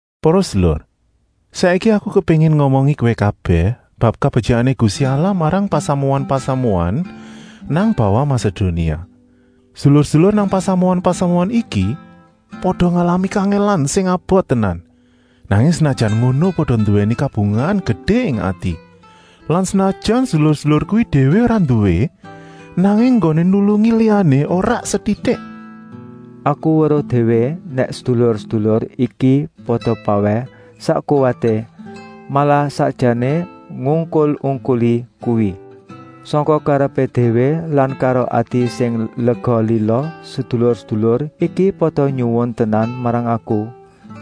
Para sedulur, saiki aku kepéngin ngomongi kowé kabèh bab kabetyikané Gusti Allah marang pasamuan-pasamuan nang bawah Masedonia. Sedulur-sedulur nang pasamuan-pasamuan iki pada ngalami kangèlan sing abot tenan, nanging senajan ngono pada nduwèni kabungahan gedé ing ati. Lan senajan sedulur-sedulur kuwi déwé ora nduwé, nanging enggoné nulungi liyané ora setitik. Aku weruh déwé nèk sedulur-sedulur iki pada pawèh sak kuwaté, malah sakjané ngungkul-ungkuli kuwi. Sangka karepé déwé lan karo ati sing lega-lila sedulur-sedulur iki pada nyuwun tenan marang aku,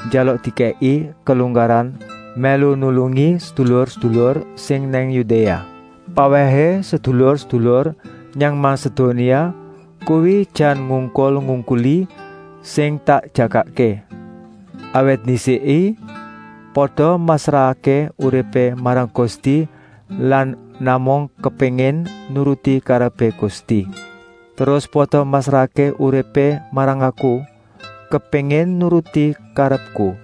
njaluk dikèki kelunggaran mèlu nulungi sedulur-sedulur sing nang Yudéa. Pawèhé sedulur-sedulur nang Masedonia kuwi jan ngungkul-ungkuli sing tak jagakké. Awit ndisiké pada masrahké uripé marang Gusti lan namung kepéngin nuruti karepé Gusti. Terus pada masrahké uripé marang aku, kepéngin nuruti karepku,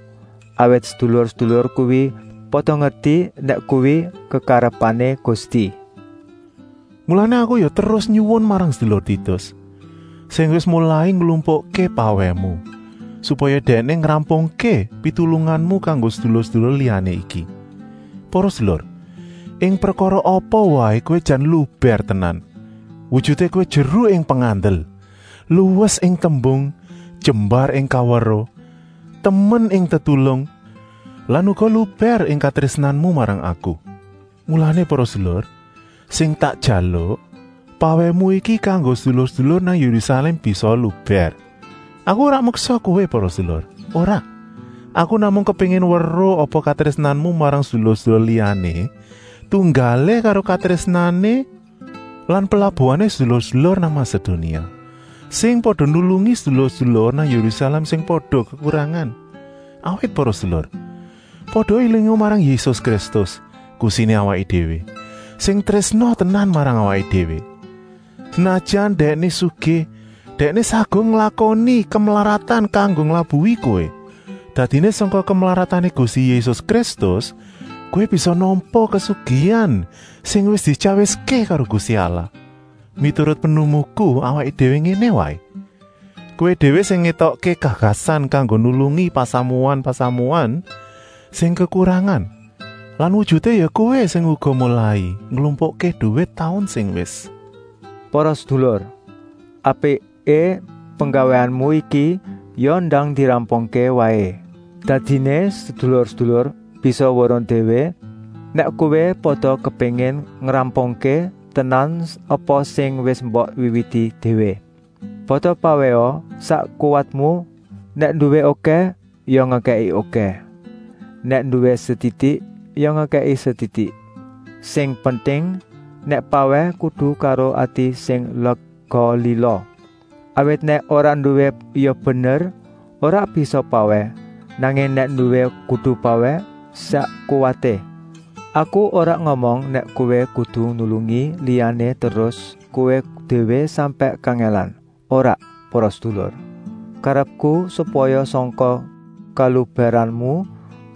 awit sedulur-sedulur kuwi pada ngerti nèk kuwi kekarepané Gusti. Mulané aku ya terus nyuwun marang sedulur Titus, sing wis molai nglumpukké pawèhmu, supaya dèkné ngrampungké pitulunganmu kanggo sedulur-sedulur liyané iki. Para sedulur, ing prekara apa waé kowé jan lubèr tenan! Wujuté kowé jeru ing pengandel, luwes ing tembung, jembar ing kaweruh, temen ing tetulung lan uga lubèr ing katrésnanku marang kowé. Mulané para sedulur, sing tak jaluk, pawèhmu iki kanggo sedulur-sedulur nang Yérusalèm bisaa lubèr. Aku ora meksa kowé para sedulur, ora, aku namung kepéngin weruh apa katrésnanmu marang sedulur-sedulur liyané tunggalé karo katrésnané lan pelabuhané sedulur-sedulur nang Masedonia, sing pada nulungi sedulur-sedulur nang Yérusalèm sing pada kekurangan. Awit para sedulur, pada élinga marang Yésus Kristus, Gustiné awaké déwé, sing trésna tenan marang awaké déwé. Senajan Dèkné sugih, Dèkné saguh nglakoni kemlaratan kanggo nglabuhi kowé. Dadiné sangka kemlaratané Gusti Yésus Kristus kowé bisa nampa kasugihan sing wis dityawiské karo Gusti Allah. Miturut pinemuku apiké ngéné waé: kowé déwé sing ngetokké gagasan kanggo nulungi pasamuan-pasamuan sing kekurangan lan wujuté ya kowé uga sing molai nglumpukké duwit taun sing wis. Para sedulur, apiké penggawéanmu iki ya ndang dirampungké waé. Dadiné sedulur-sedulur bisa weruh déwé nèk kowé pada kepéngin ngrampungké tenan apa sing wis mbok wiwiti déwé. Pada pawèha sak kuwatmu, nèk nduwé okèh ya ngekèki okèh, nèk nduwé setitik ya ngekèki setitik. Sing penting, nèk pawèh kudu karo ati sing lega-lila. Awit nèk ora nduwé ya bener ora bisa pawèh, nanging nèk nduwé kudu pawèh sak kuwaté. Aku ora ngomong nèk kowé kudu nulungi liyané terus kowé déwé sampèk kangèlan, ora, para sedulur. Karepku, supaya sangka kalubèranmu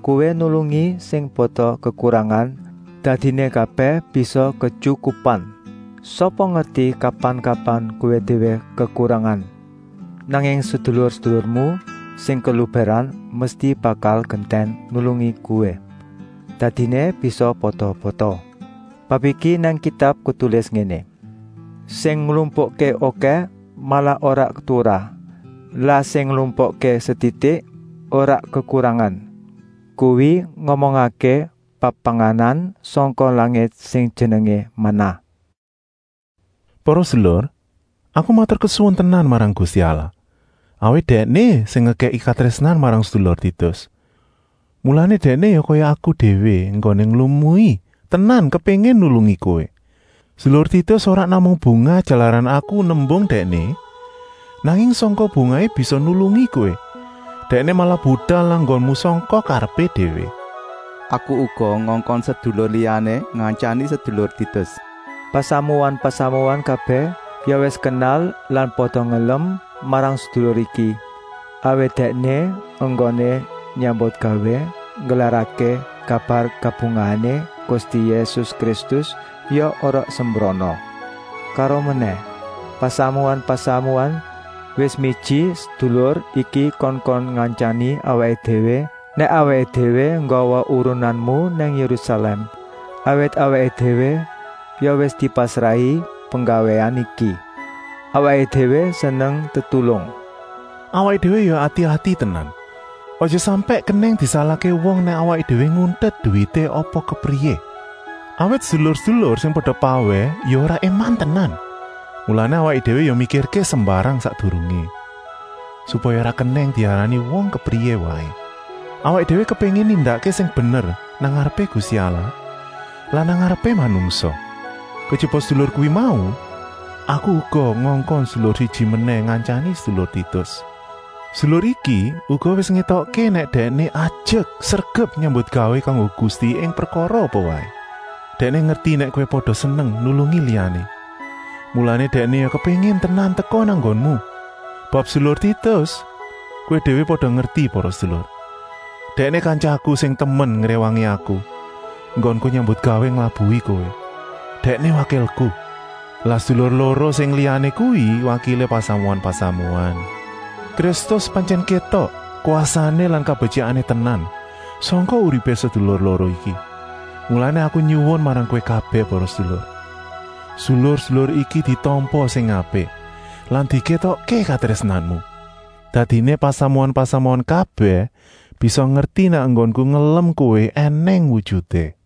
kowé nulungi sing pada kekurangan, dadiné kabèh bisa ketyukupan. Sapa ngerti kapan-kapan kowé déwé kekurangan. Nanging sedulur-sedulurmu sing kelubèran mesti bakal gentèn nulungi kowé. Dadiné bisa pada-pada. Bab iki nang Kitab ketulis ngéné: “Sing nglumpukké okèh malah ora turah, lah sing nglumpukké setitik ora kekurangan.” (Kuwi ngomongké bab panganan sangka langit sing jenengé manah.) Para sedulur, aku maturkesuwun tenan marang Gusti Allah, awit Dèkné sing ngekèki katrésnan marang sedulur Titus. Mulané dèkné ya kaya aku déwé enggoné nglumui tenan kepéngin nulungi kowé. Sedulur Titus ora namung bungah jalaran aku nembung dèkné, nanging sangking bungahé bisa nulungi kowé, dèkné malah budal nang nggonmu sangka karepé déwé. Aku uga ngongkon sedulur liyané ngantyani sedulur Titus. Pasamuan-pasamuan kabèh ya wis kenal lan pada ngelem marang sedulur iki, awit dèkné enggoné nyambutgawé nggelarké kabar kabungahané Gusti Yésus Kristus ya ora sembrana. Karomenèh, pasamuan-pasamuan wis miji sedulur iki kongkon ngantyani awaké déwé nèk awaké déwé nggawa urunanmu nang Yérusalèm, awit awaké déwé ya wis dipasrahi penggawéan iki. Awaké déwé seneng tetulung. Awaké déwé ya ati-ati tenan, aja sampèk kenèng disalahké wong nèk awaké déwé nguntet duwité apa kepriyé, awit sedulur-sedulur sing pada pawèh ya ora éman tenan. Mulané awaké déwé ya mikirké sembarang sakdurungé, supaya ora kenèng diarani wong kepriyé waé. Awaké déwé kepéngin nindakké sing bener nang ngarepé Gusti Allah lan nang ngarepé manungsa. Kejaba sedulur kuwi mau, aku uga ngongkon sedulur siji menèh ngantyani sedulur Titus. Sedulur iki uga wis ngétokké nèk dèkné ajek sregep nyambutgawé kanggo Gusti ing prekara apa waé. Dèkné ngerti nèk kowé pada seneng nulungi liyané, mulané dèkné ya kepéngin tenan teka nang nggonmu. Bab sedulur Titus kowé déwé pada ngerti para sedulur, dèkné kantyaku sing temen ngréwangi aku enggonku nyambutgawé nglabuhi kowé. Dèkné wakilku. Lah sedulur loro sing liyané kuwi wakilé pasamuan-pasamuan; Kristus pantyèn kétok kwasané lan kabetyikané tenan sangka uripé sedulur loro iki. Mulané aku nyuwun marang kowé kabèh para sedulur, sedulur-sedulur iki ditampa sing apik lan dikétokké katrésnanmu. Dadiné pasamuan-pasamuan kabèh bisa ngerti nèk enggonku ngelem kowé ènèng wujuté.